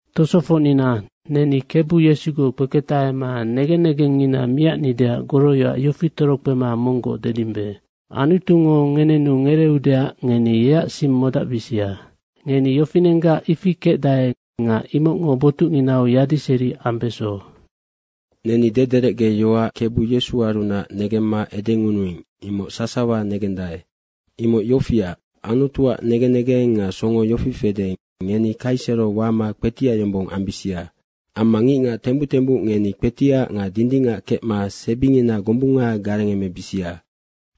Tosofocnina, neni Kebu Yesugoc kpeketahema negen negengngina miacnideac goroyoac yofi torokpema monggoc dedimbe. Anutungo ngenenu ngereeudeac ngeni yeac sing modacbisia. Ngeni yofinenggac ifi kecdae nga imocngo botucnginau yadiseri ambeso. Neni dederecgeyoac Kebu Yesuarunac negemma edengunuing, imoc sasawa negendae. Imoc yofiac, Anutuac negen negeng nga songo yofi fede, ngeni kaisero wama kpetiac yombong ambisia. Amma ngicngac tembuc tembuc ngeni kpetiac nga dindingac kecma sebingina gombunga garengemebisia.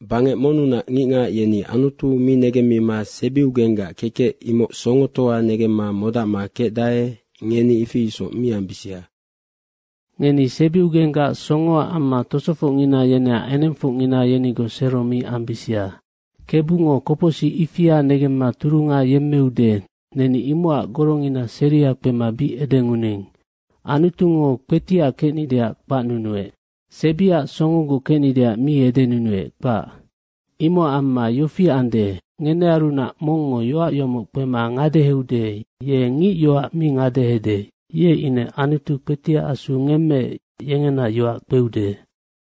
Bangec monnunac ngicngac yeni Anutu mi negemmima sebiugenggac kekec, imoc songotoa negemma modacma kecdae, ngeni ifi isoc mi ambisia. Ngeni sebiugenggac songoac amma tosofocngina yeneac engengfongngina yenigoc sero mi ambisia. Kebungo kopocsic ifia negemma turunga yemmeude, neni imocac gorongina seria kpema bic edengunuing. Anutungo kpetiac kecnideac kpacnunuec. Sebiac songogoc kecnideac mi edenunuec, kpac. Imocac amma yofi ande, ngenearunac mongngo yoac yomoc kpema ngadeheude, ye ngic yoac mi ngadehede, ye ine Anutu kpetiac Asu ngemmeec, yengena yoac kpeude.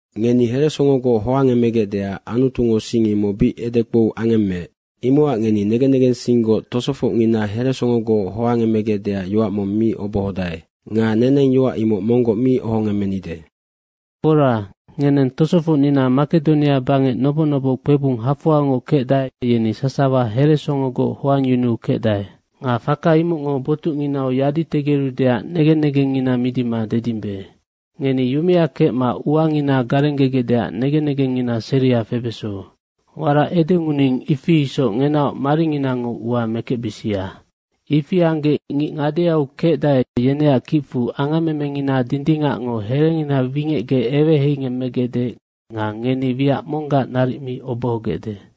Ngeni heresongogoc hoangemegecdeac Anutungo sing imoc bic edekpou angemmeec. Imocac ngeni negen negensinggoc tosofocngina heresongogoc hoangemegecdeac yoac mong mi obohodae. Nga neneng yoac imoc monggoc mi ohongemmenide. Fora, ngeneng tosofocnina Makedonia bangec noboc noboc kpebung hafoangoc kecdae, yeni sasawa heresongogoc hoangyunu kecdae, faka imocngo botucnginau yaditegerudeac negen negengngina midima dedimbe. Nga ngeni yumea kecma uangina garenggegecdeac negen negengngina seria febeso. Warac edengunuing, ifi isoc ngenaoc maringinango ua mekecbisia. Ifi anggec ngic ngadeau kecdae, yeneac kicfu angammemengina dindingacngo herengina wingecgec eweheingemmegecde nga ngeni wiac monggac naric mi obohogecde.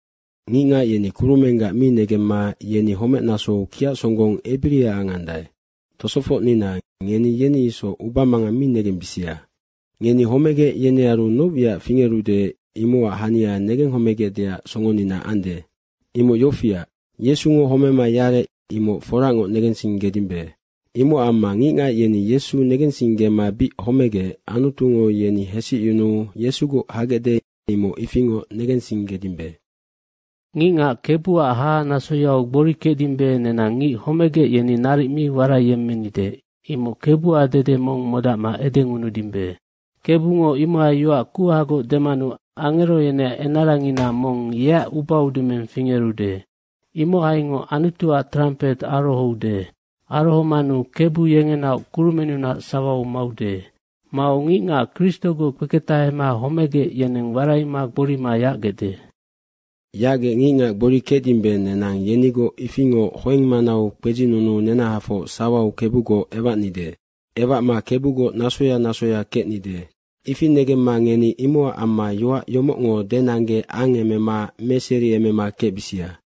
Ngicngac yeni kurumenggac mi negemma, yeni homecnasou kiac songgong ebiria angandae. Tosofocnina, ngeni yeni isoc ubamangang mi negembisia. Ngeni homegec yenearu noc wiac fingerude, imocac hania negenghomegecdeac songonina ande. Imoc yofiac, Yesungo homema yarec, imoc forangoc negensinggedimbe. Imocac amma ngicngac yeni Yesu negensinggema bic homegec, Anutungo yeni hesicyunuu Yesugoc hagecde, imoc ifingoc negensinggedimbe. Ngicngac Kebuac hahanasoyau gbori kecdimbe, nenang ngic homegec, yeni naric mi waraiyemmenide, imoc Kebuac dede mong modacma edengunudimbe. Kebungo imohai yoac kuhagoc demanu angero yeneac enarangina mong yeac ubaudumeng fingerude. Imohaingoc Anutuac trampet arohoude. Arohomanu Kebu yengenaoc kurumennunac sawau maude. Mau ngicngac Kristogoc kpeketahema homegec, yeneng waraima gborima yacgecde. Yacgec ngicngac gbori kecdimbe, nenang yenigoc ifingoc hoeng manau kpedzinunuu nenahafoc sawau Kebugoc ewacnide. Ewacma Kebugoc nasoya nasoya kecnide. Ifi negemma ngeni imocac amma yoac yomocngo denangge angemema meseriemema kecbisia.